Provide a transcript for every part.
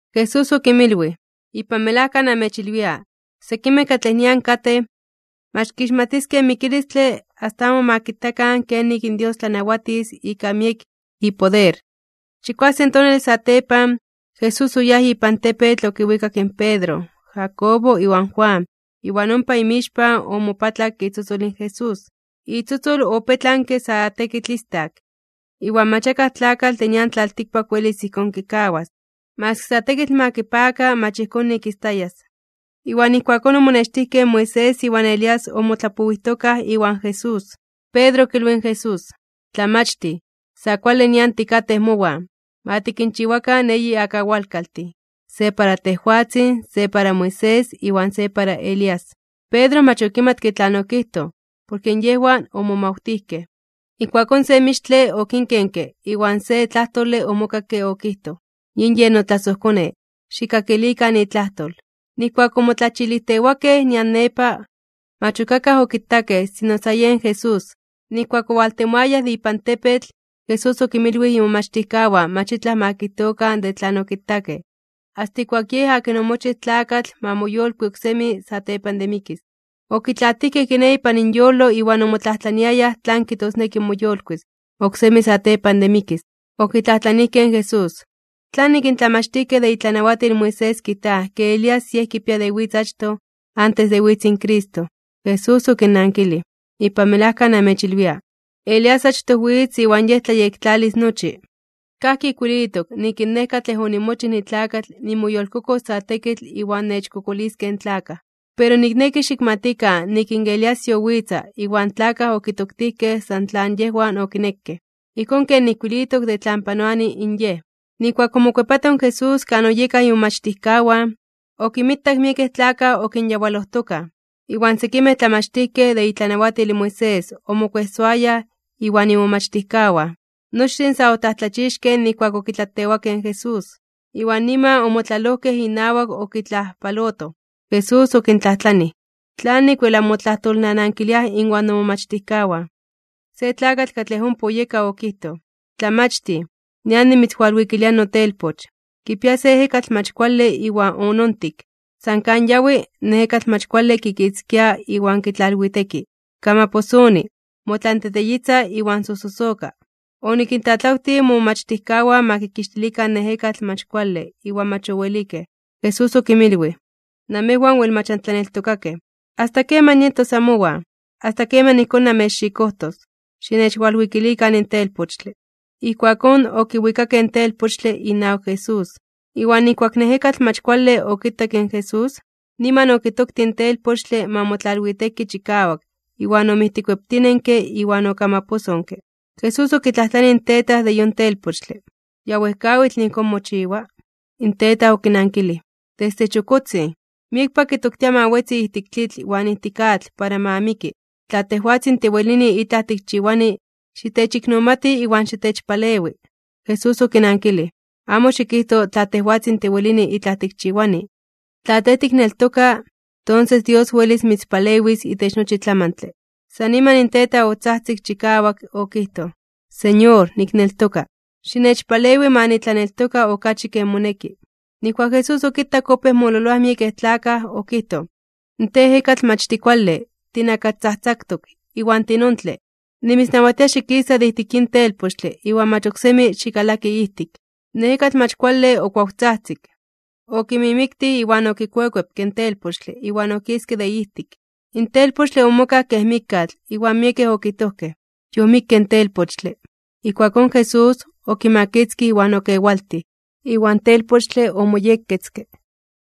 Jesús okinmilwij: ―Ipan melajka namechilwia, sekimej katlej nian katej, mach kixmatiskej in mikilistle asta amo ma kitakan kenik in Dios tlanawatis ika miek ipoder. Chikuasen tonale satepan, Jesús oyáj ipan tepetl okinwikak in Pedro, Jacobo iwan Juan. Iwan ompa inmixpan omopatlak itzotzol in Jesús. Itzotzol opetlanke sa tekitl istak, iwan mach akaj tlakatl de nian tlaltikpak welis ijkón kikawas, maski sa tekitl ma kipaka mach ijkón nik istayas. Iwan ijkuakón omonextijkej in Moisés iwan Elías omotlapowijtokaj iwan Jesús. Pedro okilwij in Jesús: ―Tlamachtij, sa kuale nian tikatej mowan. Ma tikinchiwakan eyi akawalkaltin, se para tejwatzin, se para Moisés iwan se para Elías. Pedro mach okimatke tlan okijtoj, porke yejwan omomawtijkej. Ijkuakón se mixtle okinkenke iwan se tlajtole omokakke okijtoj: ―Yin yen notlasojKone, xikkakilikan itlajtol. Nijkuak omotlachilijtewakej nian nepa, mach ok akaj okitakej sino sa yen Jesús. Nijkuak owaltemoayaj de ipan tepetl, Jesús okinmilwij imomachtijkawan mach itlaj ma kijtokan de tlan okitakej, asta ijkuak in Yej akin omochij tlakatl ma moyolkui oksemi satepan de mikis. Okitlaatijkej kiné ipan inyolo iwan omotlajtlaniayaj tlan kijtosneki moyolkuis (moyolitis) oksemi satepan de mikis. Okitlajtlanijkej in Jesús: ―¿Tlanik in tlamachtijkej de itlanawatil in Moisés kijtaj ke Elías yej kipia de witz achtoj antes de witz in Cristo? Jesús okinnankilij: ―Ipan melajka namechilwia, Elías achtoj witz iwan yej tlayektlalis nochi, kajki ijkuilitok nik in Nej katlej onimochij nitlakatl nimoyolkokos sa tekitl iwan nechkokoliskej in tlakaj. Pero nikneki xikmatikan nik in Elías yowitza iwan tlakaj okitoktijkej san tlan yejwan okinekej, ijkón ken ijkuilitok de tlan panoani in yej. Nijkuak omokuepato in Jesús kan oyekaj imomachtijkawan, okinmitak miekej tlakaj okinyawalojtokaj, iwan sekimej tlamachtijkej de itlanawatil in Moisés omokuejsoayaj iwan imomachtijkawan. Nochtin sa otlajtlachixkej (omomajmawtijkej) nijkuak okitlatewakej in Jesús, iwan niman omotlalojkej inawak okitlajpalotoj. Jesús okintlajtlanij: ―¿Tlanik wel anmotlajtolnanankiliaj inwan nomomachtijkawan? Se tlakatl katlej ompa oyeka okijtoj: ―Tlamachtij, nian nimitzwalwikilia notelpoch, kipia se ejekatl mach kuale iwan onontik. San kan yawi, in ejekatl mach kuale kikitzkia iwan kitlalwiteki, kamaposoni, motlanteteyitza iwan sojsosoka. Onikintlatlawtij momomachtijkawan ma kikixtilikan in ejekatl mach kuale iwan mach owelikej. Jesús okinmilwij: ―¡Namejwan wel mach antlaneltokakej! ¿Asta keman nietos amowan? ¿Asta keman ijkón nanmechxikojtos? Xinechwalwikilikan in telpochtle. Ijkuakón okiwikakej in telpochtle inawak Jesús, iwan nijkuak in ejekatl mach kuale okitak in Jesús, niman okitoktij in telpochtle ma motlalwiteki chikawak iwan omijtikueptinenke iwan okamaposonke. Jesús okitlajtlanij in tetaj de yon telpochtle: ―¿Ya wejkawitl ijkón mochiwa? In tetaj okinankilij: ―Desde chokotzin. Miekpa kitoktia ma wetzi ijtik tlitl iwan ijtik atl para ma miki. Tla tejwatzin tiwelini itlaj tikchiwani, xitechiknomati iwan xitechpalewi. Jesús okinankilij: ―Amo xikijto: “Tla tejwatzin tiwelini itlaj tikchiwani.” Tla tej tikneltoka, tonses Dios welis mitzpalewis itech nochi tlamantle. San niman in tetaj otzajtzik chikawak okijtoj: ―¡Señor, nikneltoka! ¡Xinechpalewi ma nitlaneltoka okachi ken moneki! Nijkuak Jesús okitak opéj mololoaj miekej tlakaj, okijtoj: ―¡Tej, ejekatl mach tikuale, tinakastzajtzaktok iwan tinontle! ¡Nimitznawatia xikisa de ijtik yin telpochtle iwan mach oksemi xikalaki ijtik! In ejekatl mach kuale okuawtzajtzik, okimimiktij iwan okikuekuepke in telpochtle iwan okiske de ijtik. In telpochtle omokaj kej mikkatl. Iwan miekej okijtojkej yomikke in telpochtle. Ijkuakón Jesús, okimakitzkij iwan okewaltij. Iwan telpochtle omoyekketzke.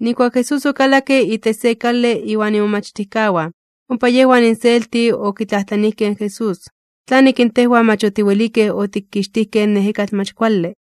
Nijkuak in Jesús okalakke itech se kale iwan imomachtijkawan, ompa yejwan inselti okitlajtlanijkej in Jesús: ―¿Tlanik in tejwan mach otiwelikej otikixtijkej in ejekatl mach kuale?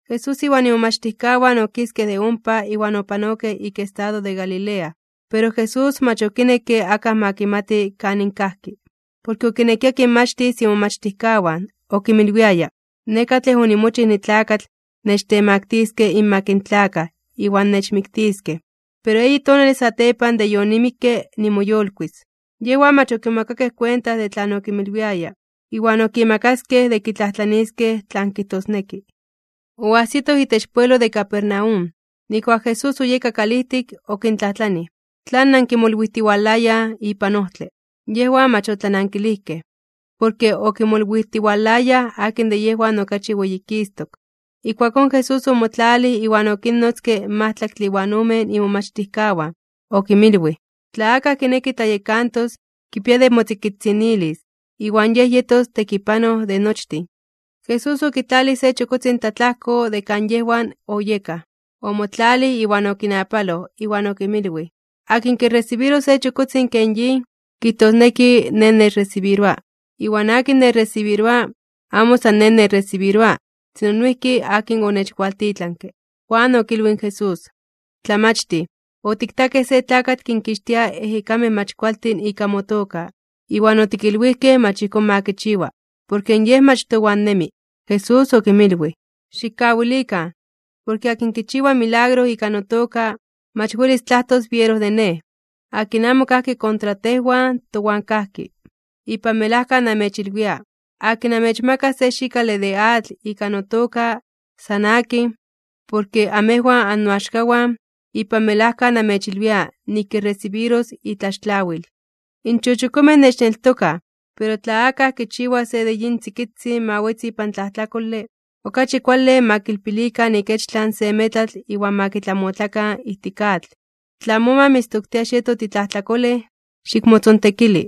Jesús iwan imomachtijkawan okiskej de ompa iwan opanokej ik estado de Galilea. Pero Jesús mach okinekke akaj ma kimati kanin kajki. Porke okinekia kinmachtis imomachtijkawan. Okinmilwiaya: ―Nej katlej onimochij nitlakatl nechtemaktiskej (nechtemaktiliskej) inmak in tlakaj iwan nechmiktiskej, pero eyi tonale satepan de yonimikke nimoyolkuis (nimoyolitis). Yejwan mach okimomakakej kuenta de tlan okinmilwiaya, iwan okimakaskej de kitlajtlaniiskej tlan kijtosneki. Oajsitoj itech pueblo de Capernaum, nijkuak in Jesús oyeka kalijtik, okintlajtlanij: ―¿Tlan nankimolwijtiwalayaj ipan ojtle? Yejwan mach otlanankilijkej, porke okimolwijtiwalayaj akin de yejwan okachi weyikistok (weyititok). Ijkuakón Jesús omotlalij iwan okinnotzke in majtlaktle iwan omen imomachtijkawan. Okinmilwij: ―Tla akaj kineki tlayekantos, kipia de motzikitzinilis, iwan yej yetos tekipanoj de nochtin. Jesús okitlalij se chokotzin tlatlajko de kan yejwan oyekaj, omotlalij iwan okinapaloj iwan okinmilwij: ―Akin kiresibiros se chokotzin ken yin, kijtosneki Nej nechresibiroa, iwan akin nechresibiroa, amo san Nej nechresibiroa, sino noijki akin onechwaltitlanke. Juan okilwij in Jesús: ―Tlamachtij, otiktakej se tlakatl kinkixtia ejekamej mach kualtin ika motoka, iwan otikilwijkej mach ijkón ma kichiwa, porke yej mach towan nemi. Jesús okinmilwij: ―Xikkawilikan, porke akin kichiwa milagro ika notoka, mach welis tlajtos biero de Nej. Akin amo kajki kontra tejwan, towan kajki. Ipan melajka namechilwia, akin anmechmakas se xikale de atl ika notoka, san akin, porke amejwan annoaxkawan, ipan melajka namechilwia nik kiresibiros itlaxtlawil. ’In chochokomej nechneltokaj, pero tla akaj kichiwa se de yin tzikitzin ma wetzi ipan tlajtlakole, okachi kuale ma kilpilikan ikechtlan se metlatl iwan ma kitlamotlakan ijtik atl. Tla moma mitztoktia xieto titlajtlakolej, xikmotzontekili.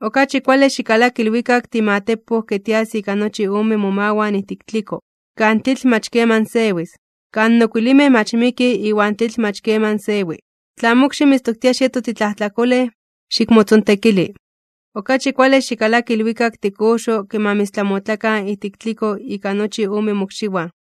Okachi kuale xikalaki ilwikak timatepoj ke tias ika nochi ome momawan ijtik tliko, kan tlitl mach keman sewis, kan okuilimej mach mikij iwan in tlitl mach keman sewi. Tla mokxi mitztoktia xieto titlajtlakolej, xikmotzontekili. Okachi kuale xikalaki ilwikak tikoxo ke ma mitztlamotlakan ijtik tliko ika nochi ome mokxiwan,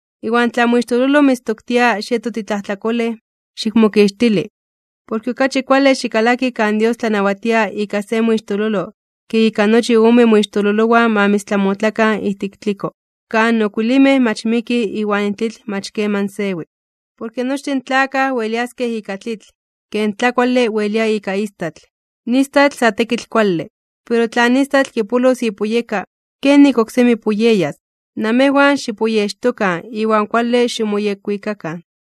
Iwan tla moixtololo mitztoktia xieto titlajtlakolej, xikmokixtili. Porke okachi kuale xikalaki kan Dios tlanawatia ika se moixtololo ke ika nochi ome moixtololowan ma mitztlamotlakan ijtik tliko, kan okuilimej mach mikij iwan in tlitl mach keman sewi. ’Porke nochtin in tlakaj weliaskej ika tlitl, ken in tlakuale welia ika istatl. In istatl sa tekitl kuale, pero tla in istatl kipolos ipuyeka, ¿kenik oksemi puyeyas? Namejwan xipuyextokan iwan kuale ximoyekwikakan.